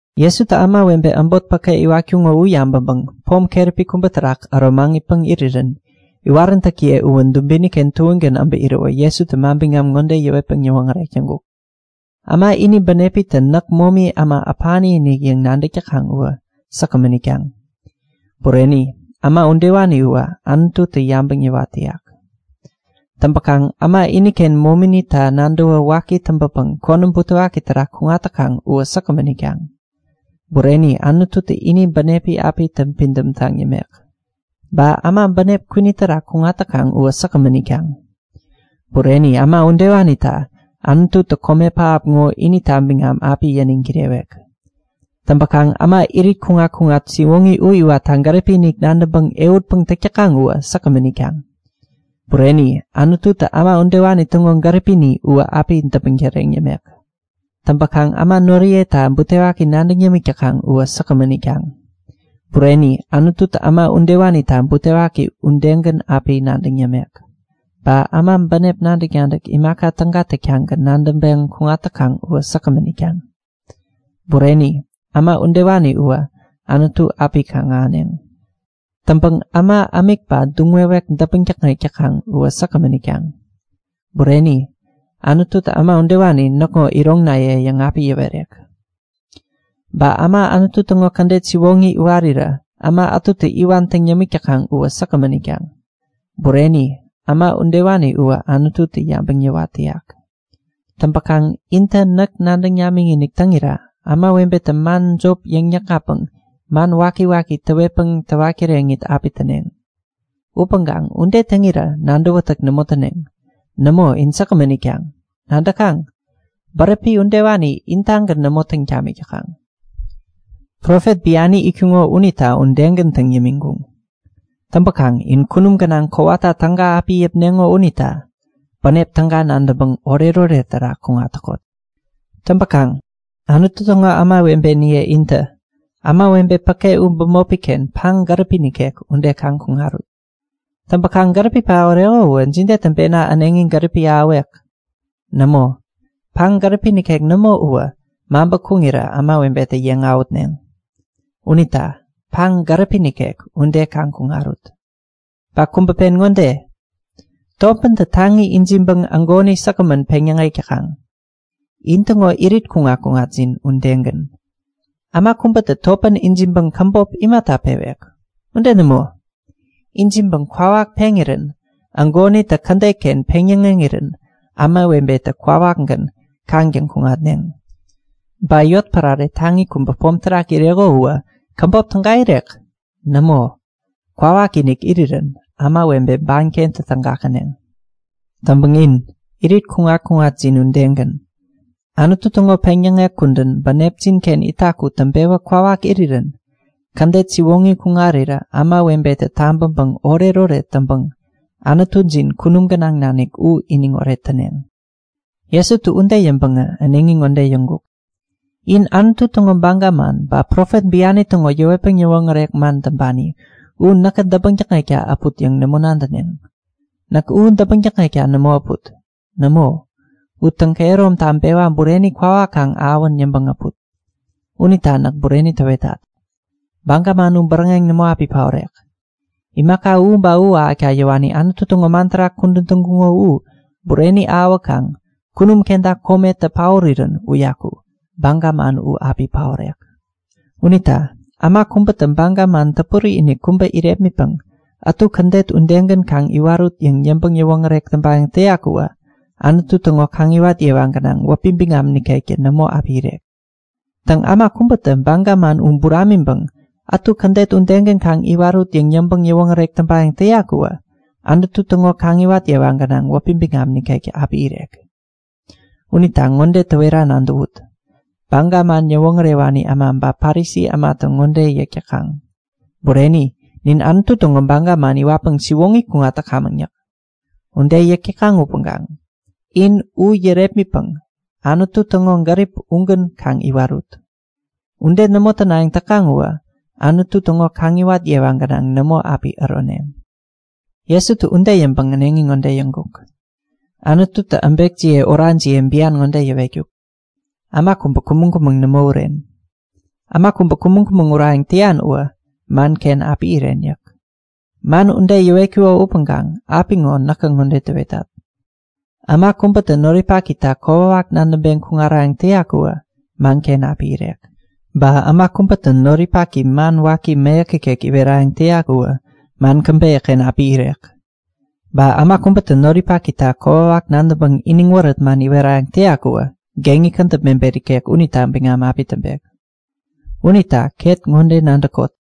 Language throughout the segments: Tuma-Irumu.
Jesutä ämawebe äbot päke iwatkuŋo u yabäŋpäŋ pom keräpi kubä terak äro maŋitpäŋ irirän iwaräntäkiye uwä dubini-ken tuägän äbä iräwä Jesutä manbiŋam ŋode yäwetpäŋ yäwoŋärek täŋkuk; Äma ini bänepitä näk momi äma äpani-inik yäŋ nadäk täkaŋ uwä säkgämän itkaŋ. Bureni! Äma udewani uwä Anututä yabäŋ yäwat täyak. Täŋpäkaŋ äma iniken mominita nadäwä waki täŋpäpäŋ konäm butewaki terak kuŋat täkaŋ uwä säkgämän itkaŋ. Bureni! Anututä ini bänepi api täŋpidäm taŋ yämek. Ba äma bänep kwini terak kuŋat täkaŋ uwä säkgämän itkaŋ. Bureni! Äma udewanita Anututä kome pähap ŋo inita biŋam api yäniŋ kirewek. Täŋpäŋ äma irit kuŋat-kuŋat siwoŋi u iwatta gäripi-inik nadäŋpäŋ ehutpäŋ täk täkaŋ uwä säkgämän itkaŋ. Bureni! Anututä äma udewani täŋo gäripini uwä api däpmäŋ täreŋ yämek. Täŋpäkaŋ äma noriyeta butewaki nadäŋ yämik täkaŋ uwä säkgämän itkaŋ. Bureni! Anututä äma udewanita butewaki udegän api nadäŋ yämek. Ba äma bänep nadäk-nadäk imaka täga täktagän nadäŋpeŋ kuŋat täkaŋ uwä säkgämän itkaŋ. Bureni! Äma udewani uwä Anutu api kaŋ-ahäneŋ. Täŋpäŋ äma ämik ba duŋwekwek däpmäŋ täkŋek täkaŋ uwä säkgämän itkaŋ. Bureni! Anututä äma udewani Näkŋo iroŋinaye yäŋ api yäwerek. Ba äma Anutu täŋo kädet siwoŋi iwarirä äma ätutä iwan täŋ yämik täkaŋ uwä säkgämän itkaŋ. Bureni! Äma udewani uwä Anututä yabäŋ yäwat täyak. Täŋpäkaŋ intä näk nadäŋ namikinik täŋirä ämawebetä man jop yäŋ-täkŋatpäŋ, man wakiwaki täwetpäŋ täwat kireŋit api täneŋ. Upäŋkaŋ ude täŋirä nadäwätäk nämo täneŋ. Nämo, in säkgämän itkaŋ. Nadäkaŋ? Bäräpi udewani intagän nämo täŋ tamik täkaŋ. Profet biani itkuŋo unita udegän täŋ yämiŋkuŋ. Täŋpäkaŋ in kunum gänaŋ kowata täga api yäpneŋo unita bänep täga nadäŋpäŋ oretoret terak kuŋat täkot! Täŋpäkaŋ Anutu täŋo ämawebeniye intä, ämawebe päke u bämopi-ken paŋ gäripi nikek ude kaŋ kuŋarut. Täŋpäkaŋ gäripi paoreko uwä jide täŋpena äneŋi gäripi ahäwek? Nämo, paŋ gäripi nikek nämo uwä maŋpä kuŋirä ämawebetä yeŋ awähutneŋ. Unita paŋ gäripi nikek ude kaŋ kuŋarut! Ba kubä pen ŋode; Topäntä taŋi ijiŋpäŋ ägoni säkgämän peŋyäŋek täkaŋ. In-täŋo irit kuŋat-kuŋatjin udegän. Äma kubätä topän ijiŋpäŋ käbop imata pewek? Ude nämo, ijiŋpäŋ kwawak peŋirän ägonitä kädet-ken peŋ-yäŋeŋirän ämawebetä kwawakgän kaŋtäŋ kuŋatneŋ. Ba yotpärare taŋi kubä pom terak ireko uwä käbop täga irek? Nämo, kwawakinik irirän ämawebe bankentä täga käneŋ. Täŋpäŋ in, irit kuŋat-kuŋatjin udegän. Anutu täŋo peŋyäŋek kudän bänepjin-ken itak u täŋpewä kwawak irirän kädet siwoŋi kuŋarirä ämawebetä tabäŋpäŋ oretoret täŋpäŋ Anutujin kunum gänaŋ nanik u iniŋoret täneŋ. Jesutä ude yäŋpäŋä äneŋi ŋode yäŋkuk; In Anutu täŋo baga man ba profet biani täŋo yäwetpäŋ yäwoŋärek man täŋpani u näkä däpmäŋ täkŋekta äpuk yäŋ nämo nadäneŋ. Näk u däpmäŋ täkŋekta nämo äput. Nämo, u täŋkehärom taŋpewa bureni kwawak kaŋ ahäwän yäŋpäŋ äput. Unita näk bureni täwetat; Baga man u bäräŋeŋ nämo api paorek. Imaka u ba u ahäkta yäwani Anutu täŋo man terak kudän täŋkuŋo u bureni ahäwäkaŋ kunum kenta kometä paorirän uyaku Baga man u api paorek. Unita äma kubätä baga man täpuri-inik kubä irepmitpäŋ ätu kädet udegän kaŋ iwarut yäŋ yäŋpäŋ-yäwoŋärek täŋpayäŋ täyak uwä Anutu täŋo kaŋiwat yewa gänaŋ wäpi biŋam nikektä nämo api irek. Täŋ, äma kubätä baga man u buramiŋpäŋ ätu kädet udegän kaŋ iwarut yäŋ yäŋpäŋ-yäwoŋärek täŋpayäŋ täyak uwä Anutu täŋo kaŋiwat yewa gänaŋ wäpi biŋam nikektä api irek. Unita ŋode täwera nadäwut; Baga man yäwoŋärewani äma ba Parisi ämatä ŋode yäk täkaŋ; Bureni, nin Anutu täŋo Baga man iwatpäŋ siwoŋi kuŋat täkamäŋ yäk. Ude yäk täkaŋ upäŋkaŋ in u yärepmitpäŋ Anutu täŋo gärip ugän kaŋ iwarut. Ude nämo tänayäŋ täkaŋ uwä Anutu täŋo kaŋiwat yewa gänaŋ nämo api äroneŋ. Jesutä ude yäŋpäŋ äneŋi ŋode yäŋkuk; Anututä äbekjiye orajiye bian ŋode yäwetkuk; Äma kubä kumäŋ-kumäŋ nämo uren. Äma kubä kumäŋ-kumäŋ urayäŋ täyan uwä manken api iren yäk. Man ude yäwetkuko upäŋkaŋ apiŋo näkä ŋode täwetat; Äma kubätä noripakita kokwawak nadäŋpeŋ kuŋarayäŋ täyak uwä manken api irek. Ba äma kubätä noripaki man waki mäyäk ikek iwerayäŋ täyak uwä man käbeyä-ken api irek. Ba äma kubätä noripakita kokwawak nadäŋpäŋ iniŋ wärät man iwerayäŋ täyak uwä geŋi kädäp mebet ikek unita biŋam api täŋpek. Unita ket ŋode nadäkot;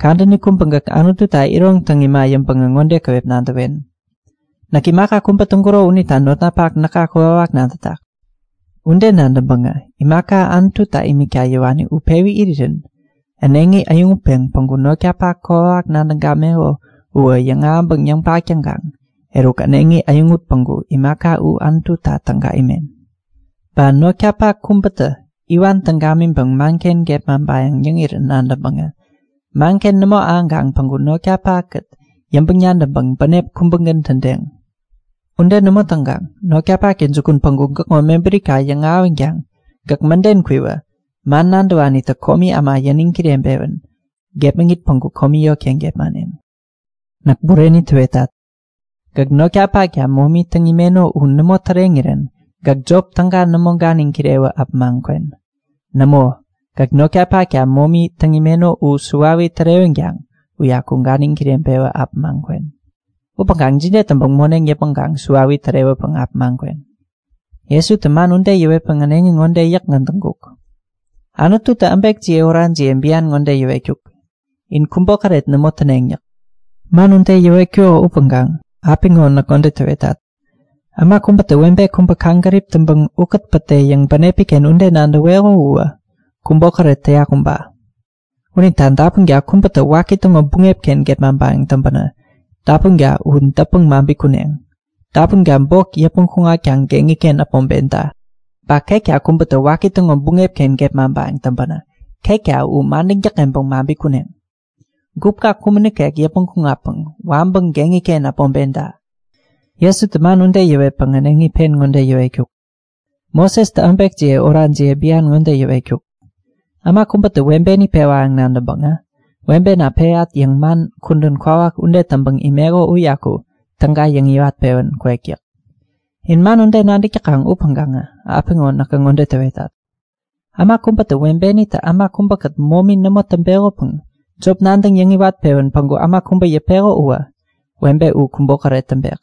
Kadäni kubä gäk Anututa iron täŋ ima yäŋpäŋä ŋode käwep nadäwen; Näk imaka kubä täŋkuro unita notnapak näka kokwawak nadätak. Ude nadäŋpäŋä imaka Anututa imikta yäwani u pewi irirän äneŋi äyäŋutpeŋ päŋku notkapak kokwawak nadäŋ gameko uwä yäŋahäŋpäŋ yäŋpak taŋkaŋ eruk äneŋi äyäŋut päŋku imaka u Anututa täga imen. Ba notkapak kubätä iwan täŋ gamiŋpäŋ manken gepmaŋpayäŋ yäŋirän nadäŋpäŋä manken nämo ahäŋkaŋ päŋku notkapak-kät yäŋpäŋ-nadäŋpäŋ bänep kubägän tädeŋ. Ude nämo täŋkaŋ notkapaktä jukun päŋku gäkŋo mebärika yäŋahäwänkaŋ gäk mäden kwiwä man nadäwanitä komi äma yäniŋ kireŋpewän gepmäŋit päŋku komi yotken gepmaneŋ. Näk bureni täwetat. Gäk notkapakta momi täŋ imeno u nämo täreŋirän gäk jop täga nämo ganiŋ kirewä äpämaŋ kwen. Nämo, gäk notkapakta momi täŋ imeno u suwawi tärewänkaŋ uyaku ganiŋ kireŋpewä äpämaŋ kwen! Upäŋkaŋ jide täŋpäŋ moneŋ yäpmäŋkaŋ suwawi tärewäpäŋ äpämaŋ kwen? Jesutä man ude yäwetpäŋ äneŋi ŋode yäkgän täŋkuk; Anututä äbekjiye orajiye bian ŋode yäwetkuk; In kubokäret nämo täneŋ yäk. Man ude yäwetkuko upäŋkaŋ apiŋo näkä ŋode täwetat; Äma kubätä webe kubä kaŋgärip täŋpäŋ ukät pätde yäŋ bänepi-ken ude nadäweko uwä kubokäret täyak uba. Unita dapunka kubätä waki täŋo buŋep-ken gepmaŋpayäŋ täŋpänä dapunka u dätpäŋ maŋpi kuneŋ. Dapunka bok yäpmäŋ kuŋatkaŋ geŋi-ken äpmoŋpenta. Ba ketka kubätä waki täŋo buŋep-ken gepmaŋpayäŋ täŋpänä ketka u madäŋ täkŋeŋpäŋ maŋpi kuneŋ! Gupka kumän nikek yäpmäŋ kuŋatpäŋ waŋpäŋ geŋi-ken äpmoŋpenta. Jesutä man ude yäwetpäŋ äneŋi pen ŋode yäwetkuk; Mosestä äbekjiye orajiye bian ŋode yäwetkuk; Äma kubätä webeni pewayäŋ nadäŋpäŋä webena peyat yäŋ man kudän kwawak ude täŋpäŋ imeko uyaku täga yäŋiwat-pewän kwek yäk. In man ude nadäk täkaŋ upäŋkaŋä apiŋo näkä ŋode täwetat; Äma kubätä webenitä äma kubäkät momi nämo täŋpekopäŋ jop nadäŋ yäŋiwat-pewän päŋku äma kubä yäpeko uwä webe u kubokäret täŋpek.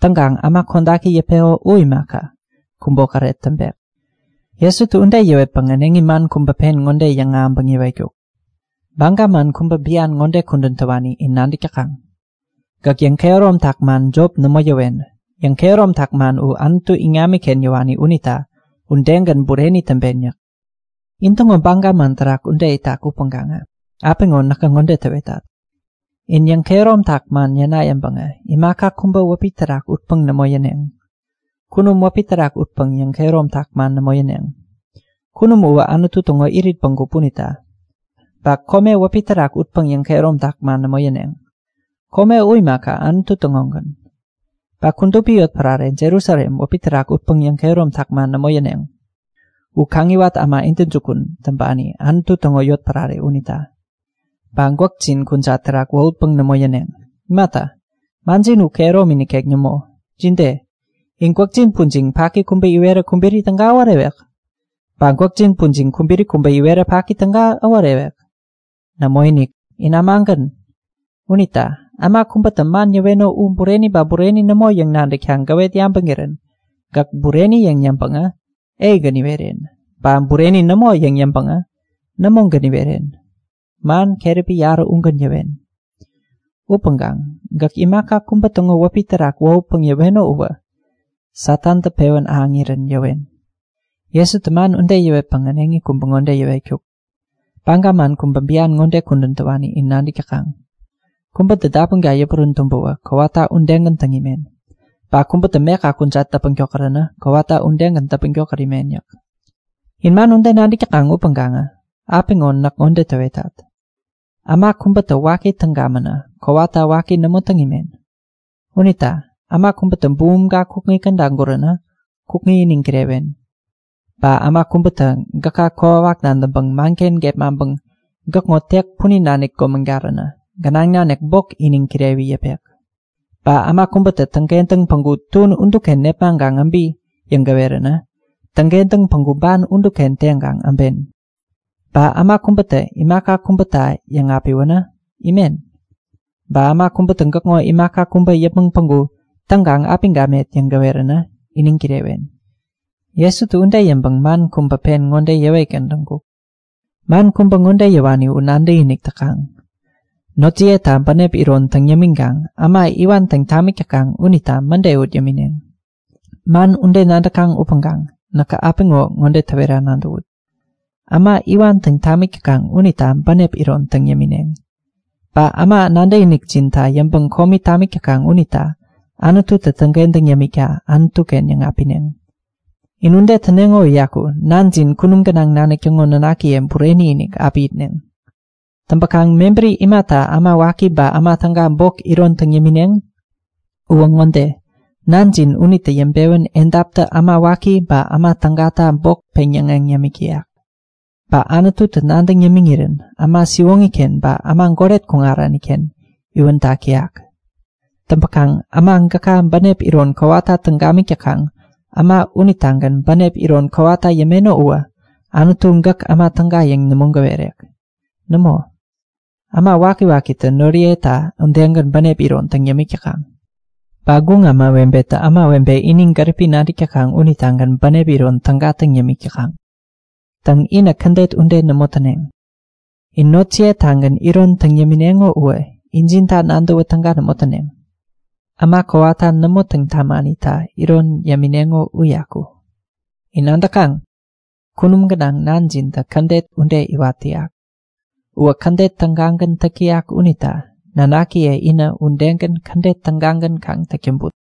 Täŋkaŋ äma kodaki yäpeko u imaka, kubokäret täŋpek. Jesutä ude yäwetpäŋ äneŋi man kubä pen ŋode yäŋahäŋpäŋ yäwetkuk; Baga man kubä bian ŋode kudän täwani in nadäk täkaŋ; Gäk yäŋkehäromtak man jop nämo yäwen. Yäŋ-kehäromtak man u Anutu iŋamiken yäwani unita udegän bureni täŋpen yäk. In-täŋo baga man terak ude itak upäŋkaŋä apiŋo näkä ŋode täwetat; In yäŋkehäromtak man yäna yäŋpäŋä imaka kubä wäpi terak utpäŋ nämo yäneŋ. Kunum wäpi terak utpäŋ yäŋkehäromtak man nämo yäneŋ. Kunum uwä Anutu täŋo irit bägup unita. Ba kome wäpi terak utpäŋ yäŋkehäromtak man nämo yäneŋ. Kome u imaka, Anutu täŋogän. Ba kudupi yotpärare Jerusalem wäpi terak utpäŋ yäŋkehäromtak man nämo yäneŋ. U Kaŋiwat Äma intäjukun täŋpani, Anutu täŋo yotpärare unita. Ba gwäkjin kujat terak wohutpäŋ nämo yäneŋ. Imata, manjin u kehäromi nikek nämo. Jide? In gwäkjin pujiŋ paki kubä iwerä kubiri täga äworewek? Ba gwäkjin pujiŋ kubiri kubä iwerä paki täga äworewek? Nämoinik, in ämagän! Unita äma kubätä man yäweno u bureni ba bureni nämo yäŋ nadäkta gäwet yabäŋirän gäk “Bureni” yäŋ yäŋpäŋä “Ei”-gän iweren. Ba “Bureni nämo” yäŋ yäŋpäŋä “Nämo”-gän iweren. Man keräpi yarä ugän yäwen. Upäŋkaŋ gäk imaka kubä täŋo wäpi terak wohutpäŋ yäweno uwä Satantä pewän ahäŋirän yäwen. Jesutä man ude yäwetpäŋ äneŋi kubä ŋode yäwetkuk; Baga man kubä bian ŋode kudän täwani in nadäk täkaŋ; Kubätä dapunka yäpurän tumbäwä kowata udegän täŋ imen. Ba kubätä meka kujat däpmäŋ tokäränä kowata udegän däpmäŋ tokät imen yäk. In man ude nadäk täkaŋ upäŋkaŋä apiŋo näkä ŋode täwetat; Äma kubätä waki täŋ gamänä kowata waki nämo täŋ imen. Unita äma kubätä bumumka kukŋi käda guränä kukŋi iniŋ kirewen. Ba äma kubätä gäka kokwawak nadäŋpäŋ manken gepmaŋpäŋ gäkŋo tek punin nanik gomägaränä gänaŋ nanik bok iniŋ kirewi yäpek. Ba äma kubätä täŋkentäŋ päŋku tuän uduken nepmaŋkaŋ äbi yäŋ gäweränä täŋkentäŋ päŋku ban uduken teŋkaŋ äben. Ba äma kubätä imaka kubäta yäŋapiwänä imen. Ba äma kubätä gäkŋo imaka kubä yäpmäŋ päŋku täŋkaŋ api gamet yäŋ gäweränä iniŋ kirewen. Jesutä ude yäŋpäŋ man kubä pen ŋode yäwetgän täŋkuk; Man kubä ŋode yäwani u nadäkinik täkaŋ; Notjiyeta bänep iron täŋ yämiŋkaŋ äma iwan täŋ tamik täkaŋ unita mäde ut yämineŋ. Man ude nadäkaŋ upäŋkaŋ näkä apiŋo ŋode täwera nadäwut; Äma iwan täŋ tamik täkaŋ unita bänep iron täŋ yämineŋ. Ba äma nadäkinikjinta yäŋpäŋ komi tamik täkaŋ unita Anututä täŋkentäŋ yämikta Anutu-ken yäŋapineŋ. In ude täneŋo uyaku Nanjin kunum gänaŋ nanik täŋo nanakiye bureni-inik api itneŋ. Täŋpäkaŋ mebäri imata äma waki ba äma täga bok iron täŋ yämineŋ? Uwä ŋode; Nanjin unitä yäŋpewän edaptä äma waki ba äma tägata bok peŋyäŋeŋ yämik täyak. Ba Anututä nadäŋ yämiŋirän äma siwoŋi-ken ba äma goret kuŋarani-ken iwän tak täyak. Täŋpäkaŋ äma gäka bänep iron kowata täŋ gamik täkaŋ äma unitagän bänep iron kowata yämeno uwä Anututä gäk äma täga yäŋ nämo gäwerek. Nämo, äma wakiwakitä noriyeta udegän bänep iron täŋ yämik täkaŋ. Ba guŋ ämawebetä ämawebe ini gäripi nadäk täkaŋ unitagän bänep iron täga täŋ yämik täkaŋ. Täŋ, inä kädet ude nämo täneŋ. In notjiye-tagän iron täŋ yämineŋo uwä injinta nadäwä täga nämo täneŋ. Äma kowata nämo täŋ tamanita iron täŋ yämineŋo uyaku! In nadäkaŋ? Kunum gänaŋ Nanjintä kädet ude iwat täyak. Uwä kädet tägagän täk täyak unita nanakiye inä udegän kädet tägagän kaŋ täk täŋput!